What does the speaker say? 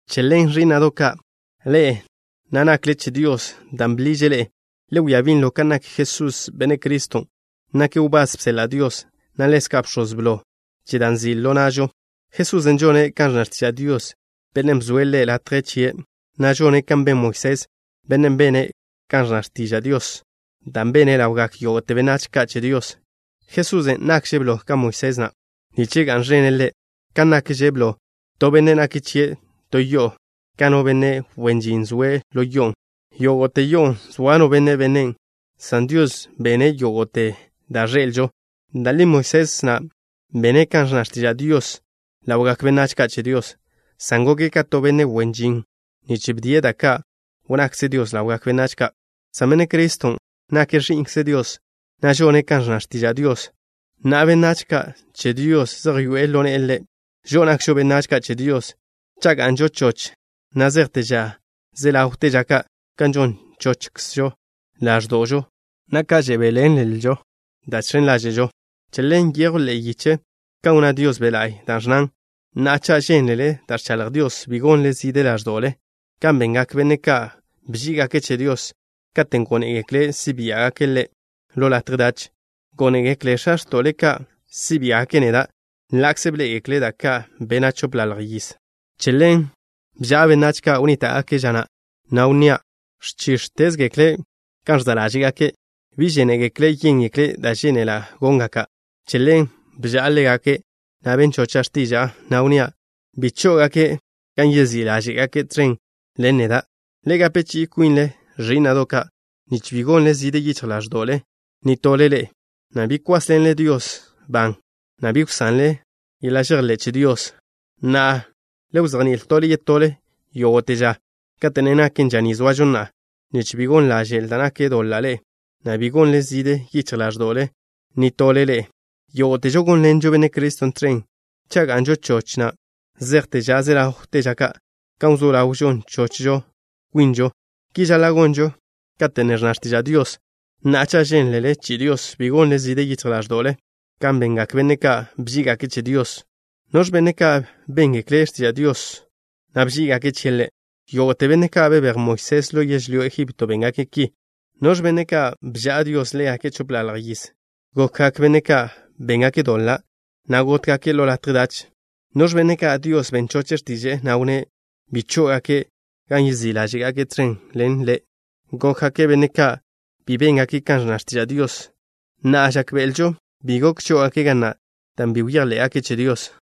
Che ḻen, ẕí'na'do' ka', ḻe'e na' nakle che Dios dan' bḻiže' ḻe'e, le wia binlo kan nak Jesús, Benne' Criston'. Nake' wbás bseḻa' Dios, na' ḻezka' bx̱oz blo che da' nzi' ḻo na'žo. Jesusen' žone' kan ẕnna x̱tiža' Dios, Bennen' bzoe' Ḻe' latje chie', na' žone' kan ben Moisés, benne' bene' kan ẕnna x̱tiža' Dios, da' bene' ḻawgak yógo'te benách ka' che Dios. Jesusen' nakže' blo ka Moisés na', nich ga'n ẕene' Ḻe', kan nakže blo to benne' nak chie' to yo'o ka no benne' wen žin zoe' ḻo yo'on'. Yógo'te yo'o, zoa no benne' benen', san Dios bene' yógo'te da' ẕḻe'elžo. Da' li Moisés na' bene' kan ẕnna x̱tiža' Dios ḻawgak benách ka' che Dios, san goke' ka to benne' wen žin, nich bdie' da' ka' wnnakze Dios ḻawgak benách ka'. San Benne' Criston' nake' Ẕi'nkze Dios, na' žone' kan ẕnna x̱tiža' Dios. Na'a benách ka' che Dios zej yoe'e ḻo ne'e Ḻe'. Žo'o nakžo benách ka' che Dios cha' ga'nžo choch na' zejte ža ze ḻawte ža ka', kan žon chochžo ḻáẕdo'žo, na' kan žebéḻenlžo da' žx̱en ḻáže'žo. Che ḻen, nyejw ḻe'e yiche kan wnná Dios Be' La'y, da' ẕnnan: Na'a, cha' žénlele da' ẕchaḻj Dios, bi gonle zide ḻáẕdo'le kan bengak benne' ka' bží'igake' che Dios katen' gónegekle' si' biá'gake' Ḻe' ḻo latje dach. Gónegekle x̱a x̱to'le ka' si' biá'gake' neda' ḻa'kze bḻé'egekle' da' ka' bena' chopḻalj yiz. Che ḻen bža'a benách ka' wnníta'gake' ža na', na' wnnía': “Ẕchíx̱tezgekle' kan ẕza' ḻáže'gake'. Bi žénegekle' yéngekle' da' žénela' góngake'.” Che ḻen bža'a ḻégake', na' ben chocha' x̱tiža'a, na' wnnía': Bi chó'ogake' gan yezí' ḻáže'gake' tẕen ḻen neda'. Le gape chi'i kwinle, ẕí'na'do' ka', nich bi gonle zide yichj ḻáẕdo'le nitole ḻe'e, na' bi kwásḻenle Dios ban, na' bi wsanle žejḻe'le che Dios. Na'a, le wzejní'il tole yetole yógo'te ža, kate' ne naken ža ni zoažo na'a, nich bi gon ḻaže'l da' nak doḻa' ḻe'e, na' bi gonle zide yichj ḻáẕdo'le nitole ḻe'e. Yógo'težo gónḻenžo Benne' Criston' tẕen cha' ga'nžo choch na' zejte ža ze ḻawte ža ka', kan wzó ḻaw žon chochžo kwinžo. Ki žaḻa' gonžo kate' ne ẕnna x̱tiža' Dios: Na'a, cha' žénlele chi'i Dios, Bi gonle zide yichj ḻáẕdo'le, Kan bengak benne' ka' bží'igake' che Dios. ¿Noẕ benne' ka' béngekle' x̱tiža' Dios, na' bží'igake' chie' Ḻe'? Yógo'te benne' ka' bebéj Moisés ḻo yežlyó Egipto béngake' ki. ¿Noẕ benne' ka' bža'a Dios ḻégake' chopḻalj yiz? Gokgak benne' ka' béngake' doḻa', na' gótgake' ḻo latje dach. ¿Noẕ benne' ka' Dios ben choche' x̱tiže'e, na' wnné' bi chó'ogake' gan yezí' ḻáže'gake' tẕen ḻen Ḻe'? Gokgak benne' ka' bi béngake' kan ẕnna x̱tiža' Dios. Na'a, žákbe'elžo bi gok chó'ogake' ga na' dan' bi bejḻé'gake' che Dios.